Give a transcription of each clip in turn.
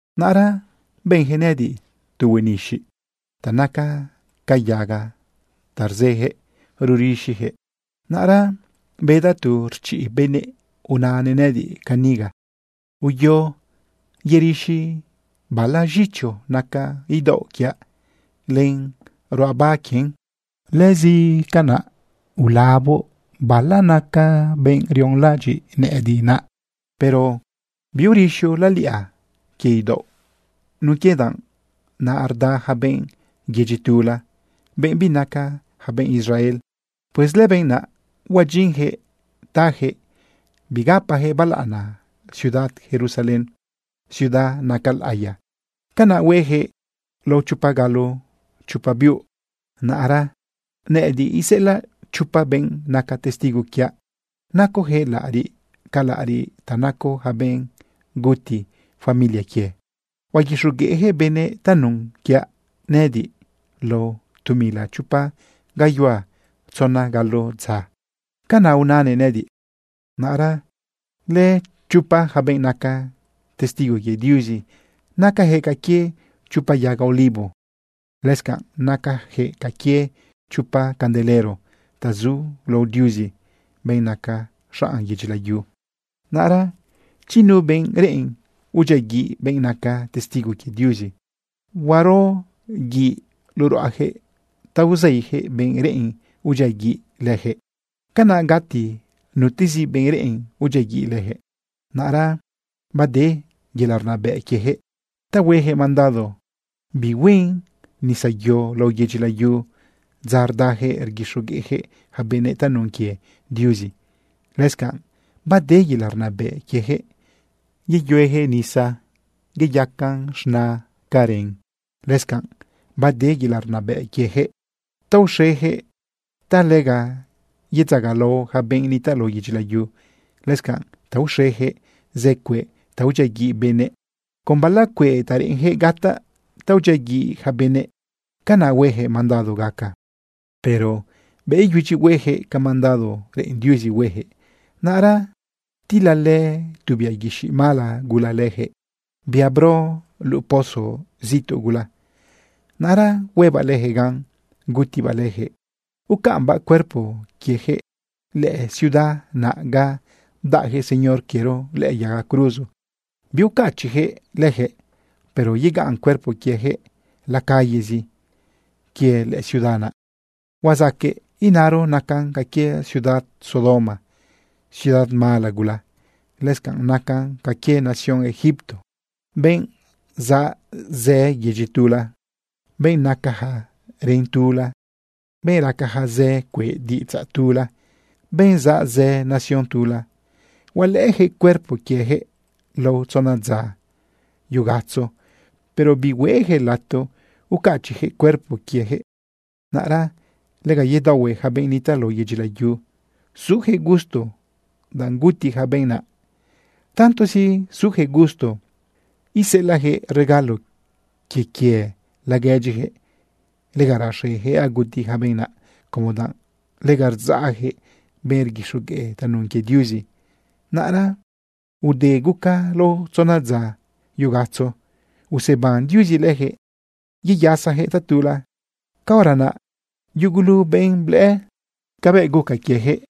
Naꞌra benjëꞌ nëꞌëdiꞌ tu huenixiꞌ ta naca ca yaga ta rzëjëꞌ rurixijëꞌ. Naꞌra bedaꞌ tu rchiꞌ benëꞌ unanëꞌ nëꞌëdiꞌ caniga: ―Uyo yerixi bala z̃icho naca idaoꞌ quiaꞌ len ruꞌaba quien. Lëscanꞌ ulaboꞌ bala naca benꞌ rionlaꞌadyiꞌ nëꞌëdiꞌ naꞌ. Pero biurixoꞌ laliꞌa quie idaoꞌ nun quie danꞌ naꞌ rda ja benꞌ yedyi tula, benꞌ binaca ja benꞌ Israel. Pues lëbenꞌ naꞌ huadyinjëꞌ tajëꞌ bigapajëꞌ balaꞌana ciudad Jerusalén, ciudad naca laꞌiya. Canaꞌ huejëꞌ lao chopa galo chopa biuꞌ. Naꞌra nëꞌëdiꞌ iseꞌelaꞌ chopa benꞌ naca testigo quiaꞌ, nacojëꞌ laꞌariꞌ ca laꞌariꞌ ta naco ja benꞌ guti familia quie. Huaguixogueꞌjëꞌ benëꞌ tanun quiaꞌ nëꞌëdiꞌ lao tu mila chopa gayuhua tzona galo dza. ―Canaꞌ unanëꞌ nëꞌëdiꞌ. Naꞌra lëchopa ja benꞌ naca testigo quie Diuzi, nacayaquëꞌ ca quie chopa yaga olivo. Lëscanꞌ nacajëꞌ ca quie chopa candelero ta zu lao Diuzi, benꞌ naca xanꞌ yedyi layu. Naꞌra chi nu benꞌ reꞌen udyiaguiꞌ benꞌ naca testigo quie Diuzi, huaro guiꞌ luꞌu ruꞌajëꞌ ta uzeijëꞌ benꞌ reꞌen udyiaguiꞌ lëjëꞌ. Canaꞌ gati nutezi benꞌ reꞌen udyiaguiꞌ lëjëꞌ. Naꞌra bade yelaꞌ rnabëꞌ quiejëꞌ ta huejëꞌ mandado bihuen nisayo lao yedyi layu dza rdajëꞌ rguixogueꞌjëꞌ ja benëꞌ tanun quie Diuzi. Lëscanꞌ bade yelaꞌ rnabëꞌ quiejëꞌ yeyuejëꞌ nisa iyacan z̃na ca ren. Lëscanꞌ bade yelaꞌ rnabëꞌ quiejëꞌ ta uxejëꞌ ta lega yedzagalao ja benꞌ nitaꞌ lao yedyi layu, lëscanꞌ ta uxejëꞌ zë cueꞌ ta udyiaguiꞌ benëꞌ. Con bala cueꞌ ta reꞌenjëꞌ gataꞌ ta udyiaguiꞌ ja benëꞌ, canaꞌ huejëꞌ mandado gaca. Pero bëꞌ iyudyi huejëꞌ ca mandado reꞌen Diuzi huejëꞌ, naꞌra tilalë tu bia guixiꞌ mala gula lëjëꞌ, bia bro luꞌu pozo zituꞌ gula. Naꞌra huebaꞌ lëjëꞌ gan, gutibaꞌ lëjëꞌ, ucaꞌmbaꞌ cuerpo quiejëꞌ lëciudad naꞌ ga bdaꞌjëꞌ Señor quiero lëꞌë yaga cruzo. Biucachiꞌyaquëꞌ leyaquëꞌ, pero yegaꞌn cuerpo quieyaquëꞌ la callezi. Quie lëciudad naꞌ huazaqueꞌ inaro nacan ca quie ciudad Sodoma, ciudad mala gula. Lëscanꞌ nacan ca quie nación Egipto. Benꞌ zaꞌ zë yedyi tula, benꞌ nacaja ren tula, benꞌ racaja zë cueꞌ diꞌidzaꞌ tula, benꞌ zaꞌ zë nación tula, hualëꞌëjëꞌ cuerpo quiejëꞌ lao tzona dza yugatzo, pero bihueꞌjëꞌ lato ucachiꞌjëꞌ cuerpo quiejëꞌ. Naꞌra lega yedaohue ja benꞌ nitaꞌ lao yedyi layu sujëꞌ gusto danꞌ guti ja benꞌ naꞌ. Tantozi sujëꞌ gusto, iseꞌelaꞌjëꞌ regalo quie quie laguedyijëꞌ. Lega raxejëꞌ aguti ja benꞌ naꞌ, como danꞌ lega rdzaꞌjëꞌ benꞌ rguixogueꞌ tanun quie Diuzi. Naꞌra ude guca lao tzona dza yugatzo, useban Diuzi lëjëꞌ yeyasajëꞌ tatula. Caora naꞌ yugulu benꞌ blëꞌë cabëꞌ guca quiejëꞌ,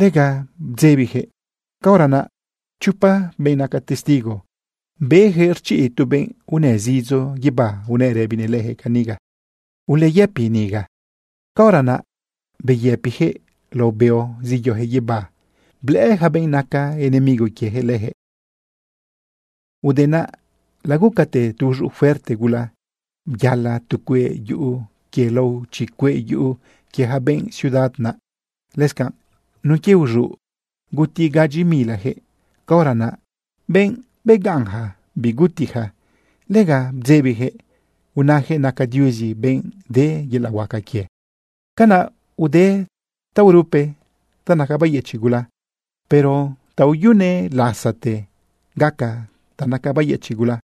lega bdzebijëꞌ. Caora naꞌ chopa benꞌ naca testigo, bejëꞌ rchiꞌ tu benꞌ unë zidzo guibá unëꞌ rëbinëꞌ lëjëꞌ caniga: ―Uleyëpi niga. Caora naꞌ beyëpijëꞌ lao beo zeyojëꞌ guibá blëꞌë ja benꞌ naca enemigo quiejëꞌ lëjëꞌ. Ude naꞌ, lagucate tu uz̃uꞌ fuerte gula, byala tu cueꞌ yuꞌu quie lao chi cueꞌ yuꞌu quie ja benꞌ ciudad naꞌ. Lëscanꞌ nun quie uz̃uꞌ guti gadyi milajëꞌ. Caora naꞌ, benꞌ begaꞌnja bigutija, lega bdzebijëꞌ unajëꞌ naca Diuzi benꞌ de yelaꞌ huaca quie. Canaꞌ ude taorupe ta naca bayëchiꞌ gula, pero taoyune lazaꞌte gaca ta naca bayëchiꞌ gula.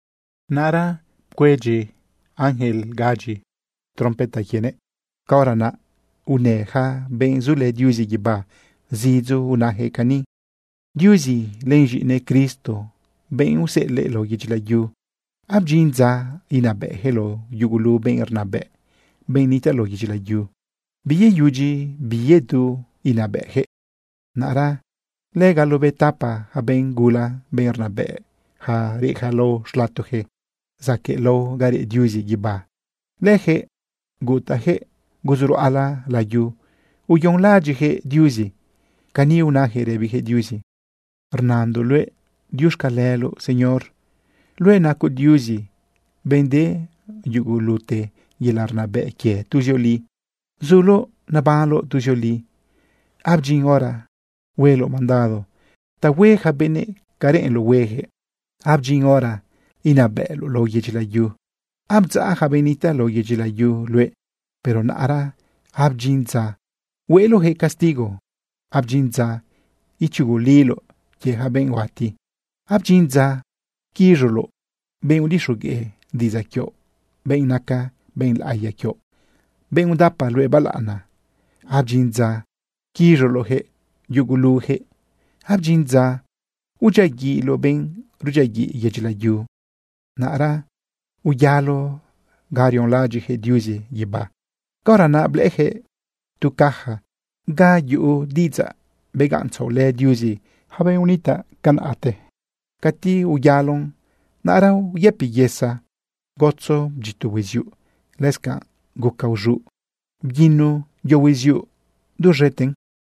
Naꞌra pcuedyi ángel gadyi trompeta quienëꞌ. Caora naꞌ unë ja benꞌ zulë Diuzi guibá zidzo unajëꞌ cani: Diuzi len z̃iꞌinëꞌ Cristo, benꞌ useꞌelëꞌ lao yedyi layu, abdyin dza inabëꞌjëꞌ lao yugulu benꞌ rnabëꞌ, benꞌ nitaꞌ lao yedyi layu. Biyeyudyi biyedu inabëꞌjëꞌ. Naꞌra lëgalobetapa ja benꞌ gula, benꞌ rnabëꞌja reꞌja lao xlatojëꞌ zaquëꞌlao ga reꞌ Diuzi guibá, lëjëꞌ gutajëꞌ guzuruꞌala layu uyonlaꞌadyiꞌjëꞌ Diuzi. Cani unajëꞌ rëbijëꞌ Diuzi: Rnandoꞌ luëꞌ diuxcaleloꞌ, Señor. Luëꞌ nacoꞌ Diuzi, benꞌ de yugulute yelaꞌ rnabëꞌ quie tuzioli. Zuloꞌ nebanloꞌ tuzioli. Abdyin hora hueloꞌ mandado ta hue ja benëꞌ ca reꞌenloꞌ huejëꞌ. Abdyin hora inabëꞌloꞌ lao yedyi layu. Abdzaꞌ ja benꞌ nitaꞌ lao yedyi layu luëꞌ. Pero naꞌra abdyin dza hueloꞌjëꞌ castigo, abdyin dza ichuguliloꞌ quie ja benꞌ huati. Abdyin dza quiz̃uloꞌ benꞌ udixogueꞌ diꞌidzaꞌ quioꞌ, benꞌ naca benꞌ laꞌiya quioꞌ, benꞌ udapa luëꞌ balaꞌana. Abdyin dza quiz̃uloꞌjëꞌ yugulujëꞌ. Abdyin dza udyiaguiꞌloꞌ benꞌ rudyiaguiꞌ yedyi layu. Naꞌra uyalo ga rionlaꞌadyiꞌjëꞌ Diuzi guibá. Caora naꞌ blëꞌëjëꞌ tu caja ga yuꞌu diꞌidzaꞌ begaꞌntzaꞌolë Diuzi ja benꞌ unitaꞌ tiempote. Cati uyalon, naꞌra uyëpi yesa, gotzo bdyito hueziuꞌ, lëscanꞌ guca uz̃uꞌ, bguino yo hueziuꞌ duz̃eten.